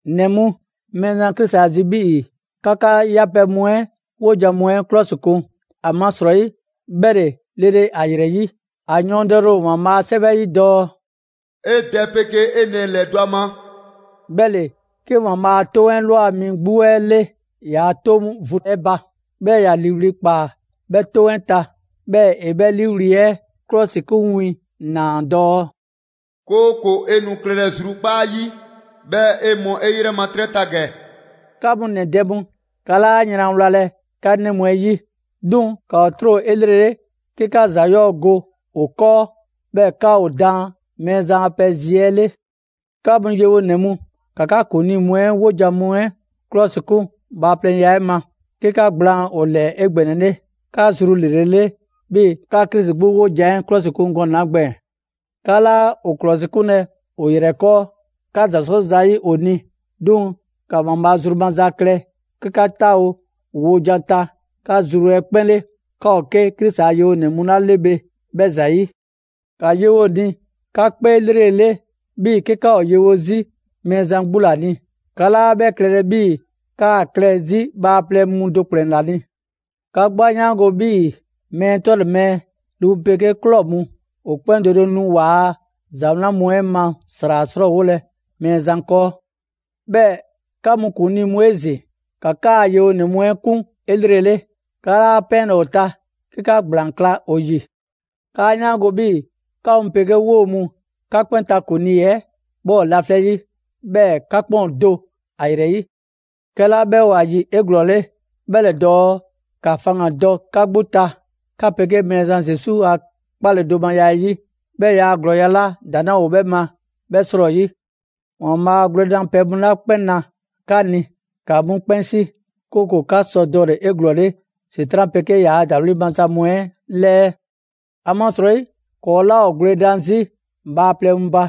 ‑Nɛ mu, Mɛɛzan Krisi ‑a zi' 'bhii‑ 'ka 'ka 'yapɛ‑ mu 'ɛ 'wojan‑ mu 'ɛ 'klɔsikun; ‑amasrɔyi 'bhɛ ‑le lele ‑a ‑yrɛ 'yi. ‑A yɔɔndɛle ‑o ‑Waanbhaa' a 'Sɛwɛ 'ɛ 'yi dɔɔ: «'E dɛ 'pegee 'e nɛɛ ‑lɛdɔ' ‑a ma,» 'bhɛ ‑le 'ke ‑Waanbhaa' a 'toŋ 'ɛ ꞊lwa mi 'gbu 'ɛ 'le ‑yaa' 'toŋ vu 'ɛ ba. 'Bhɛɛ‑ ‑ya ‑liiwli' ꞊kpaa 'bhɛ 'toŋ 'ɛ zi. 'Bhɛɛ‑ ‑e 'bhɛ ‑liiwli' 'ɛ ‑klɔsikun win ꞊naa dɔɔ: «'Kooko‑ 'e nu klɛlɛ zrukpaa' 'yi, 'bhɛɛ‑ 'e mɔ 'e 'yrɛ ma 'trɛ ta ‑gɛ.» 'Ka mu ‑nɛ dɛ mu, 'ka 'laa yran wlalɛ 'ka 'nɛ mu 'ɛ 'yi. 'Duŋ‑ ‑ka ‑o 'tro 'elrele 'ke 'ka ‑za 'yɔɔ‑ go ‑o 'kɔɔ, 'bhɛɛ‑ ‑ka ‑o daan Mɛɛzan a pɛ zi 'ɛ 'le. 'Ka mu yewonɛ mu, ‑ka 'ka ‑kuŋlii mu 'ɛ 'wojan‑ mu 'ɛ 'klɔsikun bhaaplɛŋya 'ɛ ma, 'ke 'ka ‑gblaan' ‑o ‑lɛɛ 'egbɛnɛle, 'ka zru ‑lrele' 'le 'bhii‑ 'ka Krisi 'gbu 'wojan‑ 'ɛ 'klɔsikun gɔnɛ‑ 'la gbɛɛn‑. 'Ka 'laa ‑o ‑klɔsikunlɛ ‑o ‑yrɛ 'kɔɔ, 'ka ‑za 'sɔ zayi' ‑o ni; 'duŋ‑ ‑ka ‑Waanbhaa' zru maza klɛ 'ke 'ka 'taawo‑ ‑o wojan ta 'ka zru 'ɛ 'kpɛn 'le, 'ka ‑o 'ke Krisi ‑a yewonɛ mu 'la 'le bhe 'bhɛ ‑zayi'. ‑Ka yewo ‑o ni 'ka 'kpee 'lrele‑ 'le 'bhii‑ 'ke 'ka ‑o yewo 'zi Mɛɛzan 'gbu ‑la ni; 'ka 'laa 'bhɛ klɛlɛ 'bhii‑ 'kaa klɛ 'zi bhaaplɛŋ mu do ‑kplɛn ‑la ni. 'Ka 'gbu 'a 'yaango‑ 'bhii‑ mɛɛ 'tɔle‑ mɛɛ, lu mu 'pegee ꞊klɔ mu, ‑o 'kpɛn do do nu ‑waa' ‑za wlan mu 'ɛ ma ‑sra 'srɔɔwolɛ Mɛɛzan 'kɔɔ. 'Bhɛɛ‑ 'ka mu ‑kuŋlii mu 'ezin‑, ‑ka 'kaa‑ yewonɛ mu 'ɛ 'kun 'elrele; 'ka 'laa 'pɛɛnlɛ‑ ‑o ta 'ke 'ka ‑gblaan kla ‑o ‑yi. 'Kaa 'yaango‑ 'bhii‑ 'ka mu 'pegee 'woo‑ mu, 'ka 'kpɛn ta ‑kuŋlii' 'ɛ 'bhɛ ‑o laflɛ' 'yi, 'bhɛɛ‑ 'ka 'kpɛn ‑o do ‑a ‑yrɛ 'yi. 'Kɛla 'bhɛ ‑o ‑a ‑yi 'eglɔɔle, 'bhɛ ‑le dɔɔ ‑ka faŋgandɔ 'ka 'gbu ta 'ka 'pegee Mɛɛzan Zesu a 'kpaledomaya 'ɛ 'yi, 'bhɛɛ‑ ‑yaa' ‑glɔɔy' 'la ‑daŋ' 'laa ‑o 'bhɛ ma 'bhɛ 'srɔyi. ‑Waanbhaa' gwledanpɛ 'la 'kpɛn na 'ka ni, ‑ka 'mu 'kpɛn 'si; 'kooko‑ 'ka sɔ dɔle‑ 'eglɔɔle ‑Setran' 'pegee ‑yaa' ‑dawli' maza mu 'ɛ 'lɛɛ. ‑Amasrɔyi, ‑kɔɔ' 'laa ‑o gwledan 'zi bhaaplɛŋ mu ba.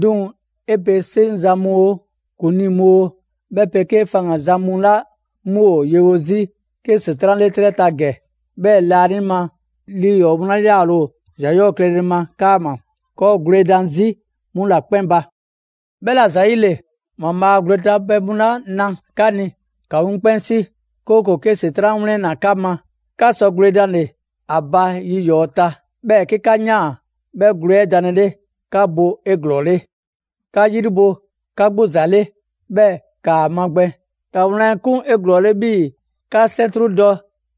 'Duŋ‑ 'e pe 'seŋzan‑ mu oo, ‑kuŋlii mu oo, 'bhɛ 'pegee faŋganzan mu 'la 'mu ‑o yewo 'zi 'ke ‑Setran' 'le 'trɛ ta ‑gɛ, 'bhɛɛ‑ laanima lii ‑yɔɔ' mu 'la 'yaale‑ ‑o ‑za 'yɔɔ‑ klɛle 'kaama‑, ‑kɔɔ' ‑o gwledan 'zi 'mu ‑la 'kpɛn ba. 'Bhɛla‑ ‑zayile, ‑Waanbhaa' gwle danpɛ mu 'la na 'ka ni, ‑ka 'mu 'kpɛn 'si; 'kooko‑ 'ke ‑Setran' 'wlɛnna‑ 'ka ma, 'ka sɔ gwledanle ‑a ba yi ‑yɔɔ' ta. 'Bhɛɛ‑ 'ke 'ka ꞊yaan 'bhɛ gwle 'ɛ danlele, 'ka bo 'eglɔɔle. 'Ka 'yri bo 'ka 'gbu ‑za 'le, 'bhɛɛ‑ 'kaa‑ magbɛn: ‑Ka wlan 'ɛ 'kun 'eglɔɔle 'bhii‑ 'ka 'sɛntru dɔ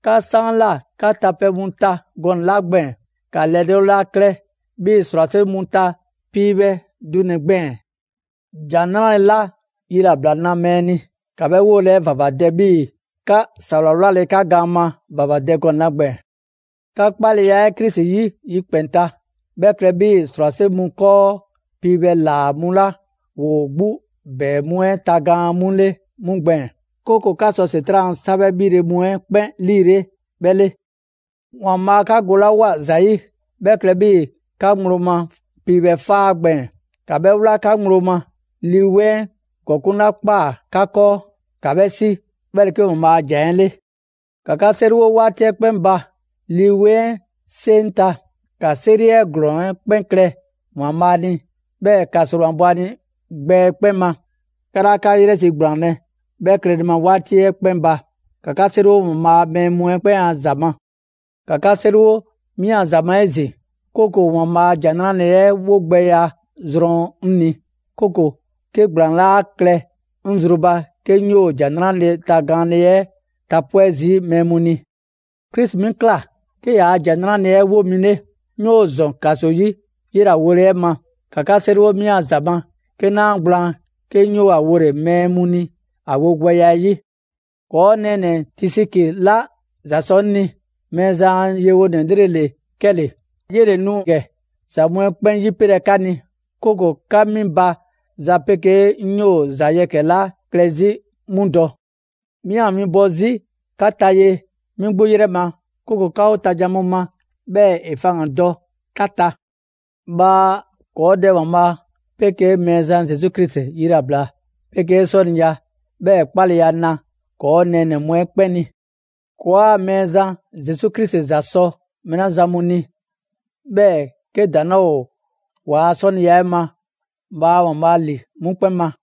'ka 'saanla 'ka ta pɛ mu ta gɔnɛ‑ 'la gbɛɛn‑, ‑ka ‑lɛdɔɔleya klɛ 'bhii‑ ‑srwase' mu ta piibhɛ dunɛ‑ gbɛɛn‑. ‑Jan 'Nrale‑ 'la yilabla na mɛɛ ni, ‑ka 'bhɛ 'wole‑ 'ɛ ‑vavadɛ 'bhii‑ 'ka ‑sawla 'wlale 'ka gaan ma ‑vavadɛ gɔnɛ‑ 'la gbɛɛn‑. 'Ka 'kpaleya Krisi 'yi yikpɛn‑ ta 'bhɛ klɛ 'bhii‑ ‑srwase' mu 'kɔɔ piibhɛ ‑laa mu 'la ‑woo 'gbu ‑bɛɛ mu 'ɛ tagaan 'mu 'le 'mu gbɛɛn‑; 'kooko‑ 'ka sɔ ‑Setran' a 'sabhɛ‑ ‑bhile mu 'ɛ 'kpɛn 'liile 'bhɛ 'le. ‑Waanbhaa' 'ka golawoa ‑za 'yi, 'bhɛ klɛ 'bhii‑ 'ka ŋgblo ma piibhɛ 'faa gbɛɛn‑; ‑ka 'bhɛ 'wla 'ka ŋgblo ma. Lii 'Weŋ 'ɛ ‑gɔkuŋ' 'la ꞊kpaa 'ka 'kɔɔ, ‑ka 'bhɛ 'si, 'bhɛ ‑le 'ke ‑Waanbhaa' a ‑Jan 'ɛ 'le. ‑Ka 'ka 'seriwo 'waati 'ɛ 'kpɛn ba Lii 'Weŋ 'ɛ 'seŋ ta, ‑ka 'seri 'ɛ ‑glɔɔn 'ɛ 'kpɛn klɛ ‑Waanbhaa' ni, 'bhɛɛ‑ ‑ka ‑sromabɔ ‑a ni gbɛ 'ɛ 'kpɛn ma. 'Ka 'laa 'ka 'yrɛ zi ‑gblaanlɛ' 'bhɛ klɛle ma 'waati 'ɛ 'kpɛn ba. ‑Ka 'ka 'seriwo ‑Waanbhaa' a mɛɛ mu 'ɛ 'kpɛn a ‑za ma. ‑Ka 'ka 'seriwo 'mi a ‑za ma 'ezin‑; 'kooko‑ ‑Waanbhaa' ‑Jan 'Nrale‑ 'ɛ 'wo gbɛya zrɔn 'ŋ ni. 'Bhɛɛ‑ 'kooko‑ 'ke ‑gblaan 'laa klɛ 'ŋ zru ba 'ke 'ŋ 'yoo‑ ‑Jan 'Nrale‑ tagaanle 'ɛ tapwɛ' zii' mɛɛ mu ni. Krisi 'mi ꞊kla 'ke 'yee‑ ‑Jan 'Nrale‑ 'ɛ 'wo mi 'le; 'ŋ 'yoo‑ ‑zɔn ‑kaso 'yi 'yela‑ wole 'ɛ ma. ‑Ka 'ka 'seriwo 'mi a ‑za ma 'ke 'naa gblaan 'ke 'ŋ 'yoo‑ ‑a wole‑ mɛɛ mu ni ‑a wogbɛya 'ɛ 'yi. ‑Kɔɔ' nɛɛnɛ‑ Tisiki 'la ‑za sɔ 'ŋ ni; Mɛɛzan a yewonɛ 'lrele‑ ‑le 'kɛle‑. 'Yele‑ nu ‑gɛ za mu 'ɛ 'kpɛn 'yipelɛ 'ka ni, 'kooko 'ka 'mi ba za 'pegee 'ŋ 'yoo‑ ‑za yɛkɛ‑ 'la klɛ 'zi 'mu dɔ. 'Mi ‑a winbɔ 'zi 'ka ta ye 'mi 'gbu 'yrɛ ma, 'kooko‑ 'ka 'o ta jan mu ma, 'bhɛɛ‑ ‑e faŋgandɔ 'ka ta. Bhaa ‑kɔɔ' Dɛ ‑Waanbhaa' 'pegee Mɛɛzan Zesu Krisi yilabla 'pegee 'sɔniya, 'bhɛɛ‑ 'kpaleya na ‑kɔɔ' nɛɛnɛ‑ mu 'ɛ 'kpɛn ni. ‑Kɔɔa' Mɛɛzan Zesu Krisi ‑za sɔ mɛɛ 'la zan mu ni, 'bhɛɛ‑ 'ke ‑daŋ' 'laa ‑o ‑waa' 'sɔniya 'ɛ ma, bhaa ‑Waanbhaa' ‑li 'mu 'kpɛn ma!